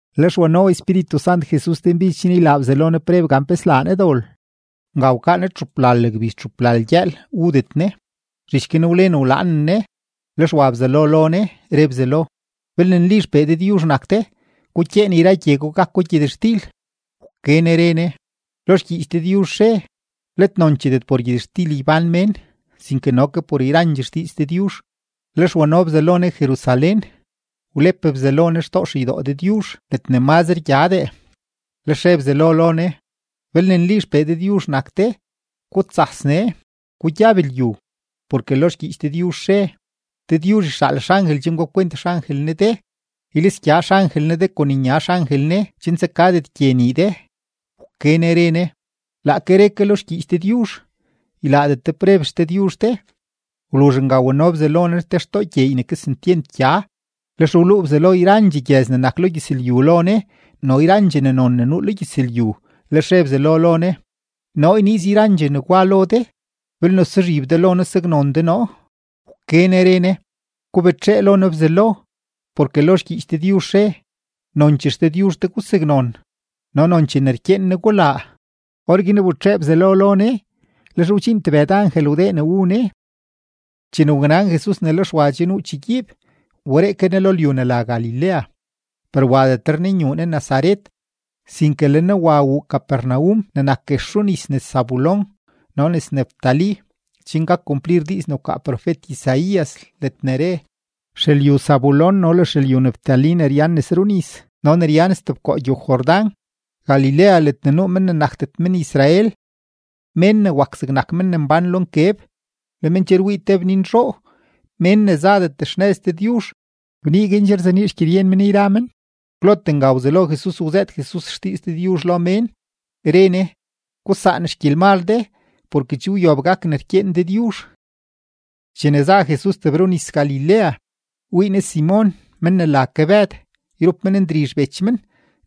Lex wano Espíritu Sant Jesus denbidx chen ylaa Bzelo Ne preb gan pe slaa Ne dol. Nga wkaa Ne txuplal gbiz txuplal gyëël wudet Ne, zhich guin wlen wlaanen Ne. Lex wa Bzelo lo Ne, re Bzelo: ―Belne nli XPee Dëdyuzh nak de, gukyeen yra gye gwa gako gyëtxtil. Wke Ne re Ne: ―Lo xgyiich Dëdyuzh re: “Let noncheedet por gyëtxtil ybán mén, sinke no ke por yrandxee xdiiz Dëdyuzh.” Lex wano Bzelo Ne Jerusalén, wlep Bzelo Ne xtoo xeydoo Dëdyuzh ledne mazre gyadee. Lex re Bzelo lo Ne: ―Belne nli XPee Dëdyuzh nak de, gutsas nee, gugyab lyu, porke lo xgyiich Dëdyuzh re: Dëdyuzh yxaal xangel chen gapkwent xangel Ne de. Ylisgya xangel Ne de kon nya xangel Ne chen tsakadet gye nii de. Wke Ne re Ne: ―Laake re ke lo xgyiich Dëdyuzh: “Ylaadet de preb XDëdyuzh de.” Wluzh nga wano Bzelo Ne te xtoo gyeey ne kesentyent gya, lex wluu Bzelo yrandxee gyëz ne nak lo gyëzlyu lo Ne no le yrandxee ne non ne nuu lo gyëzlyu. Lex re Bzelo lo Ne: ―Noo yniiz yrandxee negwa lo de belne suzhib de lo noo saknon de noo. Wke Ne re Ne: ―Gubetxee lo noo Bzelo, porke lo xgyiich Dëdyuzh re: “Nonchee XDëdyuzh de gusaknon, no nonchee ne rkyeen Ne gulaa.” Orguin wbetxee Bzelo lo Ne. Lex wdxiin tebëd angel wdee ne wu Ne. Chene waknan Jesus ne le Xwa che nuu chegyiib, wberee ke Ne lo lyu ne la Galilea. Per wadetre Ne nyuu Ne Nazaret, sinke le Ne wa wuu Capernaum ne nak guex runis nes Zabulón no nes Neftalí, chen gak kumplir diiz ne wkaa profet-Isaías ledne re: Xelyu Zabulón no le xelyu Neftalí ne ryan nes runis no ne ryan stebkoo gyow-Jordán, Galilea ledne nuu mén ne nakdet men-Israel. Mén ne wak zegnak men ne mbán lo nkeb, le men che wii te bninzhoo; mén ne zadet xnëz Dëdyuzh, bnii guin che rzenii xgyeryen men yra men. Kwlote nga wzelo Jesus wzëët Jesus xdiiz Dëdyuzh lo mén, re Ne: ―Gusaan xgyelmal de porke che wyob gak ne rkyeen Dëdyuzh. Chene za Jesus tebrunis-Galilea, wii Ne Simon men ne la ke Bëd yrup men Ndrizh bech men,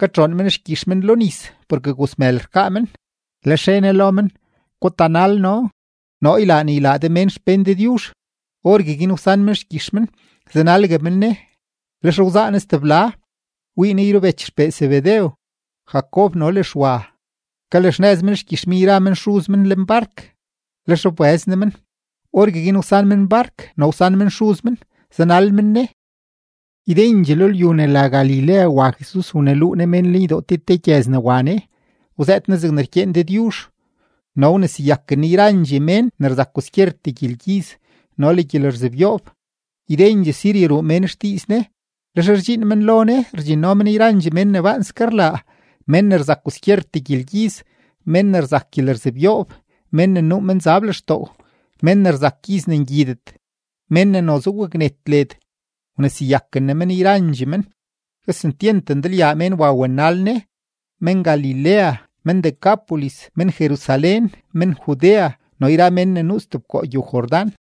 katxoon men xgyix men lo nis porke gozmël rkaa men. Lex re Ne lo men: ―Gutanal noo; noo ylaa ne ylaa de mén xpén Dëdyuzh. Orgueguin wsan men xgyix men, zanalgue men Ne. Lex wzaa Ne stebla, wii Ne yrubech xpee Zebedew, Jacob no le Xwa, kalaxnëz men xgyix men yra men xuz men lenbark. Lex wbëz Ne men, orgueguin wsan men bark no wsan men xuz men, zanal men Ne. Ydendxee lo lyu ne la Galilea wa Jesus waneluu Ne mén lenydoo te te gyëz ne wa Ne, wzëët Ne zegne rkyeen Dëdyuzh no wneseyaken Ne yrandxee mén ne rzak kwaskyertee gyelgyiz no le gyelerzebyoob. Ydendxee Siria ruu mén xdiiz Ne, lex rdxiin men lo Ne rdxinno men yrandxee mén ne baanske rlaa, mén ne rzak kwaskyertee gyelgyiz, mén ne rzak gyelerzebyoob, mén ne nuu menzab lextoo, mén ne rzak gyiz ne ngyidet, mén ne noze waknet led; wneseyaken Ne men yrandxee men. Kesentyent ndalyaa mén wa wanal Ne, men-Galilea, men-Decápolis, men-Jerusalén, men-Judea, no le yra mén ne nuu stebkoo gyow-Jordán.